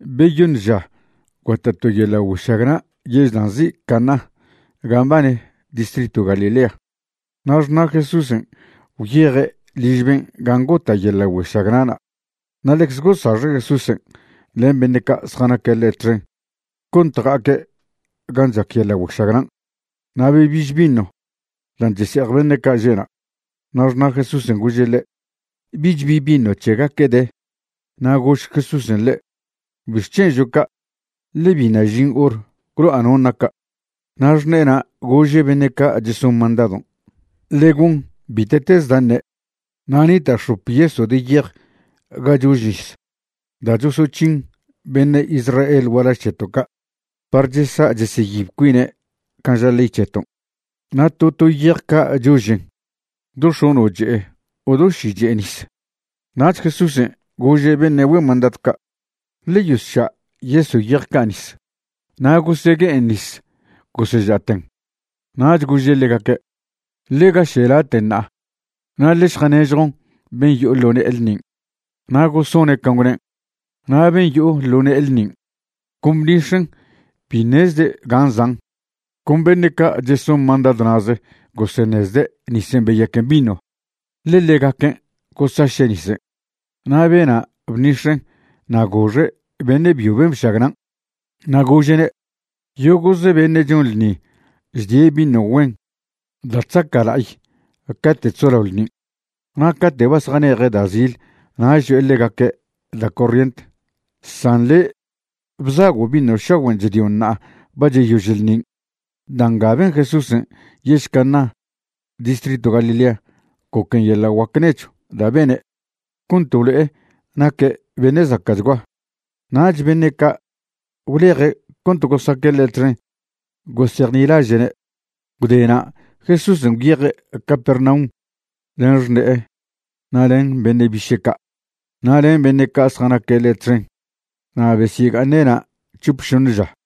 Beyoṉ ža gota' to yeḻa' güešagna' yež da' nzi' Caná gan' mbane distritw Galilea. Na' xṉa' Jesúsen' gwyeje' liž ben' gan' gota' yeḻa' güešagna'na'. Na' ḻecze gosaxe' Jesúsen' len beṉe' ca' zjanaque' ḻe' txen cont ja'aque' gan' chac yeḻa' güešagnan'. Na' bebiž vino dan' chese'ej beṉe' ca' že'na', na' xṉa' Jesúsen' gože' ḻe': ―Bich bi vino c̱hegaque' de. Na' gož Jesúsen' ḻe': ―¿Bixc̱hen' žo' ca'? ḻe biṉa' žin hor gwlo'a non' naca'. Na' xṉe'ena' gože' beṉe' ca' cheson mandadon': ―Ḻe gon bite'tez da' ṉe'. Na' nita' x̱op yeso' de yej ga chož nis da' chosoc̱hin beṉe' Israel gualaž c̱heto' ca' par chesa' cheseyib cuine' can' ža ley c̱heton'. Na' to to yej ca' chožen do x̱ono' che'e o do ši che'e nis. Nach Jesúsen' gože' beṉe' güen mandadw ca': ―Ḻe yosša' yeso' yej ca' nis. Na' gosegue'en nis goseža'ten. Nach gože' ḻegaque': ―Ḻe gaše' laten' ṉa'a na' ḻe šjanežjon ben' yo'o ḻo ne'e ḻṉin'. Na' gosone' can' gwnen'. Na' ben' yo'o ḻo ne'e ḻṉin' con bṉix̱en' bi ṉezde' gan' zan', con beṉe' ca' cheson mandadw na'ze goseṉezde' nisen' beyaquen vino, ḻe ḻegaquen' gosaše' nisen'. Na' bena' bṉix̱en' na' goxe' beṉe' byo ben' bšagnan', na' gože'ne': ―Yogo'ze beṉe' chon ḻṉi chdie' vino güen da' chzaca' la'ay cate' chzolao ḻṉin', na' cate' ba zjane'eje' da' zil nach cho'e ḻegaque' da' corrient. San le' bzago' vino šagüen' chdion' ṉa'a ba cheyož ḻṉin'. Da' nga ben Jesúsen' yež Caná distritw Galilea goquen yeḻa' guac nechw da' bene' cont blo'e naque' beṉe' zaca'chgua, nach beṉe' ca' gwleje' cont gosaque' ḻe' txen gosejnilaže'ne'. Gwde na' Jesúsen' gwyeje' Capernaum len xṉe'e na' len beṉe' biše' ca', na' len beṉe' ca' zjanaque' ḻe' txen, na' besyega'aṉe' na' c̱hop šoṉe ža.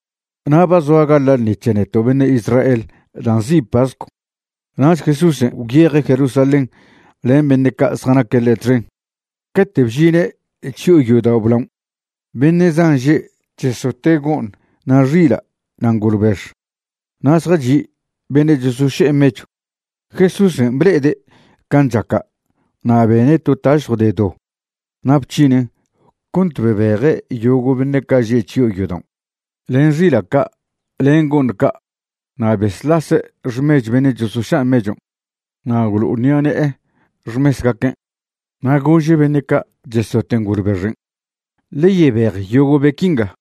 Na' ba zoa gaḻa' ḻṉi c̱he neto' beṉe' Israel da' nzi' pascw, nach Jesúsen' gwyeje' Jerusalén len beṉe' ca' zjanaque' ḻe' txen. Cate' bžine' chyo'o yodao' blaon' beṉe' zan že' chesote' go'ṉ na' xila' na' ngolbex, na' zjachi' beṉe' chosoše'e mechw. Jesúsen' ble'ede' can' chaca' na' bene' to tašjw de do na' bc̱hinen' cont bebeje' yogo' beṉe' ca' že' chyo'o yodaon', len xila' ca', len go'ṉ ca', na' besḻase' xmechw beṉe' chosoša' mechon' na' gwlo'oṉi'ane'e xmesgaquen'. Na' gože' beṉe' ca' chesote' ngolbexen': ―Ḻe yebej yogo' be qui nga.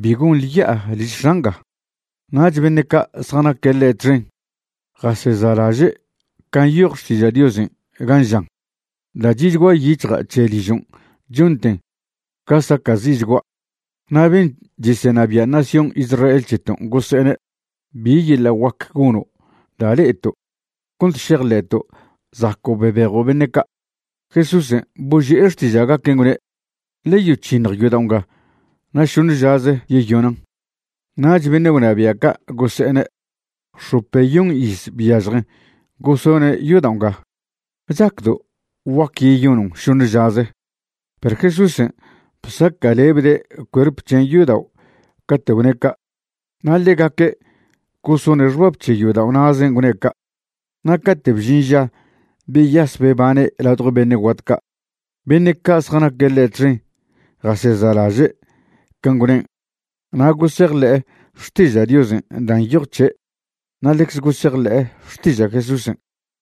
Bi gonḻe ya'a liž X̱a' nga. Nach beṉe' ca' zjanaque' ḻe' txen jaseza'laže' can' nyoj Xtiža' Diosen' gan' žan: “Da' chi'chgua yic̱hja' c̱he ližon' chonten ga saca'zi'chgua'.” Na' ben' chesenabia' nación Israel c̱heton' gose'ene': ―¿Bi yeḻa' guac gono' da' le'eto' cont šejḻe'to' zaco' bebejo' beṉe' ca'? Jesúsen' boži'e xtiža'gaquen' gwne': ―Ḻe yoc̱hiṉj yodao' nga na' šoṉe žaze yeyonan'. Nach beṉe' gwnabia' ca' gose'ene': ―X̱opeyon iz byažjen gosone' yodao' nga, ¿chacdo' guac yeyonon' šoṉe žaze? Perw Jesúsen' bsaca'lebde' cuerp c̱hen' yodao' cate' gwne' ca', na' ḻegaque' gosone' xbab c̱he yodao' na'zen' gwne' ca'. Na' cate' bžin ža beyas bebane' ladjo beṉe' guat ca', beṉe' ca' zjanaque' ḻe' txen jaseza'laže' can' gwnen' na' gosejḻe'e Xtiža' Diosen' dan' nyoj c̱he' na' ḻecze gosejḻe'e xtiža' Jesúsen'.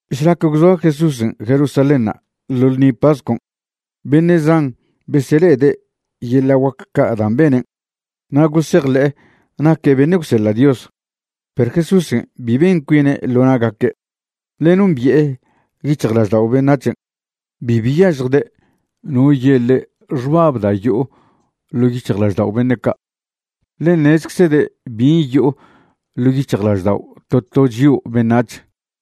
Šlac gwzoa Jesúsen' Jerusalénṉa' ḻo ḻṉi pascon' beṉe' zan besele'ede' yeḻa' guac ca' dan' benen' na' gosejḻe'e naque' beṉe' gwseḻa' Dios. Perw Jesúsen' bi ben cuine' ḻo na'gaque', ḻe nombi'e yic̱hjlaždao' beṉac̱hen'. Bi byažjde' no ye' ḻe' xbab da' yo'o ḻo' yic̱hjlaždao' beṉe' ca'. Ḻe ṉezeczede' bin' yo'o ḻo' yic̱hjlaždao' to to chio' beṉac̱h.